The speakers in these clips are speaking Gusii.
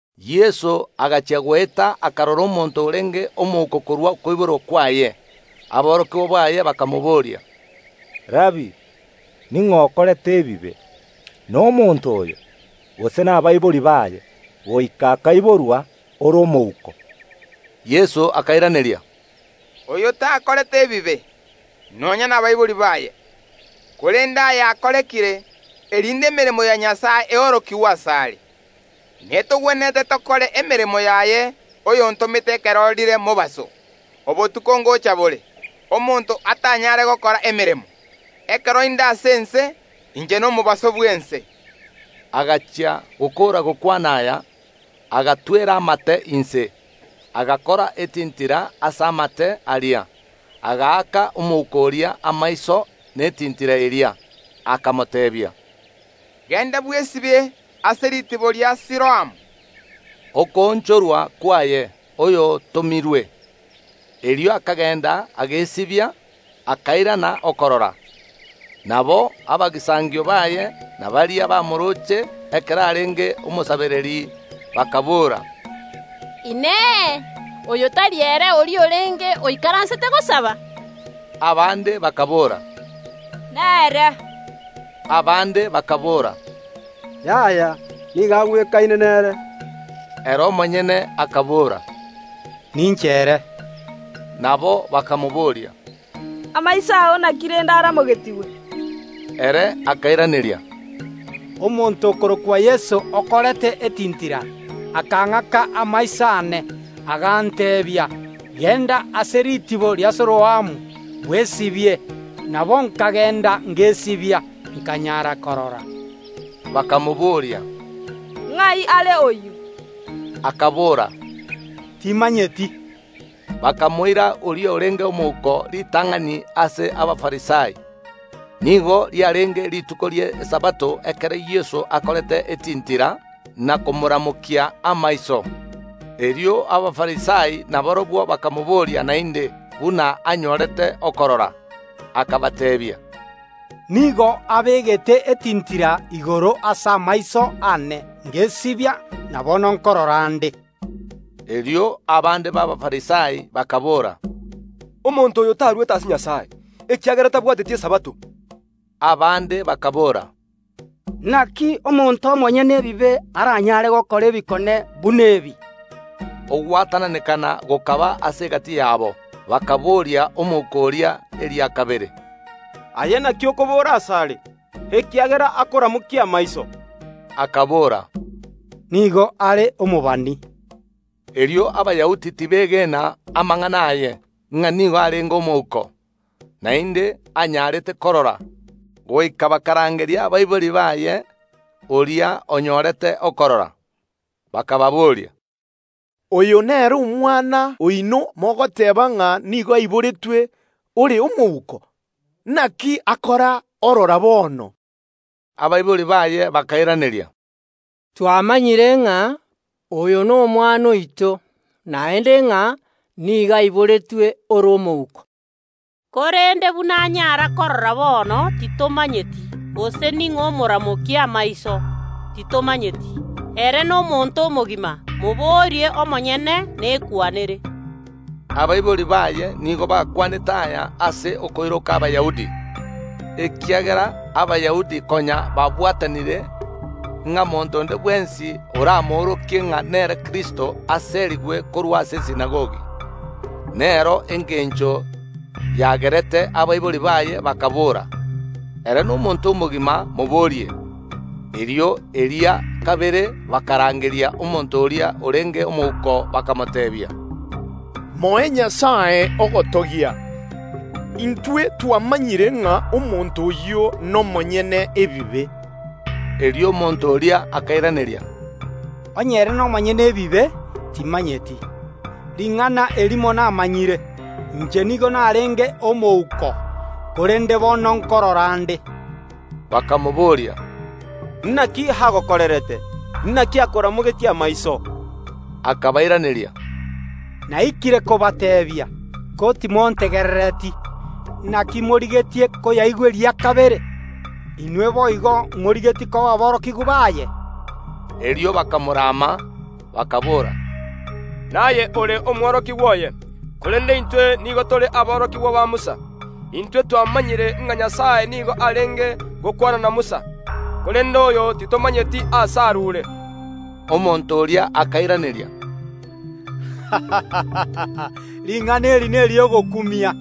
Yeso agachia goeta akarora omonto orenge omouko korwa okoiborwa kwaye. Aborokigwa baye bakamobooria, “Rabii, ning’o okorete ebibe, nomonto oyo, gose nabaibori baye, goika akaiborwa ore omouko?” Yeso akairaneria, “Oyo takorete ebibe, nonya nabaibori baye, korende aya akorekire, erinde emeremo ya Nyasae eorokigwe asare. Netogwenerete tokore emeremo yaye oyontomete ekero rire mobaso; obotuko ngocha bore, omonto atanyare gokora emeremo. Ekero inde ase ense, inche nomobaso bw’ense.” Agachia gokoora gokwana aya, agatwera amate inse, agakora etintira ase amate aria, agaaka omouko oria amaiso netintira eria, akamoteebia, “Genda bwesibie ase ritibo ria Siloamuu” (okoonchorwa kwaye, oyotomirwe). Erio akagenda agesibia, akairana okorora. Nabo abagisangio baye, na baria bamorooche ekero arenge omosabereri bakaboora, “Inee! Oyo tari ere oria orenge oikaransete gosaberera?” Abande bakaboora, “Nere”; abande bakaboora, “Yaya, nigo agwekaine nere.” Ere omonyene akabora, “Ninche ere.” Nabo bakamobooria, “Amaiso ao naki rende aramogetigwe?” Ere akairaneria, “Omonto okorokwa Yeso okorete etintira, akang’aka amaiso aane, aganteebia: Genda ase ritibo ria Siloamuu, bwesibie; nabo nkagenda ngesibia, nkanyara korora.” Bakamobooria, “Ng’ai are oyio?” Akabora, “Timanyeti.” Bakamoira oria orenge omouko ritang’ani ase Abafarisai. Nigo riarenge rituko ri’Esabato ekero Yeso akorete etintira na komoramokia amaiso. Erio Abafarisai nabarabwo bakamobooria naende buna anyorete okorora. Akabateebia, “Nigo abegete etintira igoro ase amaiso aane, ngesibia, na bono nkorora nde.” Erio abande b’Abafarisai bakaboora, “Omonto oyo tarwete ase Nyasae, ekiagera tabwateti Esabato.” Abande bakaboora, “Naki omonto omonyene ebibe aranyare gokora ebikone buna ebi?” Ogwatananekana gokaba ase egati yabo. Bakaboria omouko oria eria kabere, “Aye naki okobora asare, ekiagera akoramokia amaiso?” Akabora, “Nigo are omobani.” Erio Abayahudi tibeegena amang’ana aye, ng’a nigo arenge omouko, naende anyarete korora, goika bakarangeria abaibori baye oria onyorete okorora, bakababoria, “Oyo nere omwana oino mogoteeba ng’a nigo aiboretwe ore omouko? Naki akora orora bono?” Abaibori baye bakairaneria, “Twamanyire ng’a oyo nomwana oito, naende ng’a nigo aiboretwe ore omouko; korende buna anyara korora bono, titomanyeti, gose ning’o omoramokia amaiso, titomanyeti. Ere nomonto omogima, moborie omonyene, nekwanere.” Abaibori baye nigo bakwanete aya ase okoiroka Abayahudi, ekiagera Abayahudi konya babwatanire, ng’a monto onde bwensi oramoorokie ng’a nere Kristo aserigwe korwa ase esinagogi. Nero engencho yagerete abaibori baye bakaboora, “Ere nomonto omogima, moborie.” Erio eria kabere bakarangeria omonto oria orenge omouko, bakamoteebia, “Moe Nyasae ogotogia; intwe twamanyire ng’a omonto oyio nomonyene ebibe.” Erio omonto oria akairaneria, “Onye ere nomonyene ebibe, timanyeti; ring’ana erimo namanyire, inche nigo narenge omouko, korende bono nkorora nde.” Bakamobooria, “Naki agokorerete? Naki akoramogetie amaiso?” Akabairaneria, “Naikire kobateebia, ko timontegerereti. Naki morigetie koyaigwa eria kabere? Inwe boigo morigetie koba aborokigwa baye?” Erio bakamorama, bakaboora, “Naye ore omworokigwa oye, korerende intwe nigo tore aborokigwa ba Musa. Intwe twamanyire ng’a Nyasae nigo arenge gokwana na Musa, korende oyo titomanyeti aase arure.” Omonto oria akairaneria, “Ring’ana eri neri’ogokumia,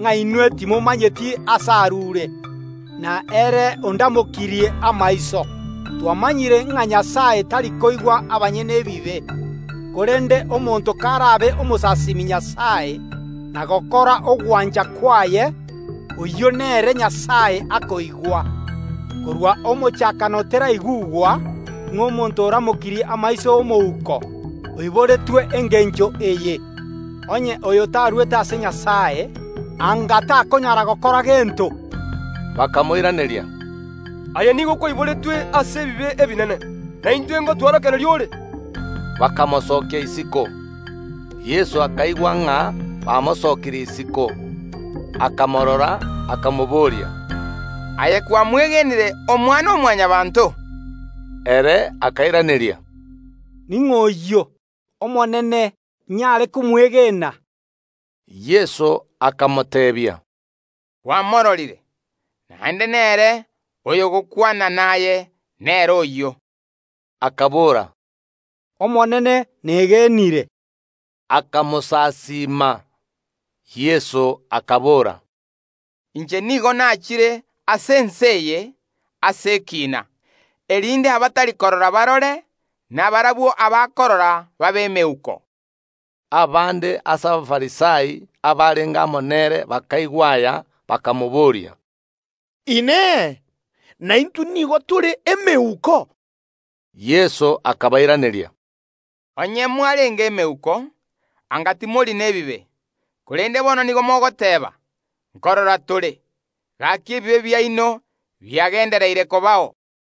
ng’a inwe timomanyeti aase arure, na ere ondamokirie amaiso. Twamanyire ng’a Nyasae tari koigwa abanyene ebibe; korende omonto karabe omosasimi Nyasae, na gokora ogwancha kwaye, oyio nere Nyasae akoigwa. Korwa omochakano teraigugwa ng’a omonto oramokirie amaiso ’omouko oiboretwe engencho eye. Onye oyo tarwete ase Nyasae, anga takonyara gokora gento.” Bakamoiraneria, “Aye nigo kwaiboretwe ase ebibe ebinene, na intwe ngotworokereria ore?” Bakamosokia isiko. Yeso akaigwa ng’a bamosokirie isiko, akamorora, akamobooria, “Aye kwamwegenire Omwana‐o‐Mwanyabaanto?” Ere akairaneria, “Ning’o oyio, Omonene, inyare komwegena?” Yeso akamoteebia, “Kwamororire, naende nere oyogokwana naye nere oyio.” Akabora, “Omonene, negenire”; akamosasiima. Yeso akabora, “Inche nigo nachire ase ense eye ase ekiina, erinde abatari korora barore, na barabwo abakorora babe emeuko.” Abande ase Abafarisai abarenge amo nere bakaigwa aya, bakamobooria, “Inee! Naintwe nigo tore emeuko?” Yeso akabairaneria, “Onye mwarenge emeuko, anga timori nebibe; korende bono nigo mogoteeba: Nkorora tore; gaki ebibe biaino biagendereire kobao.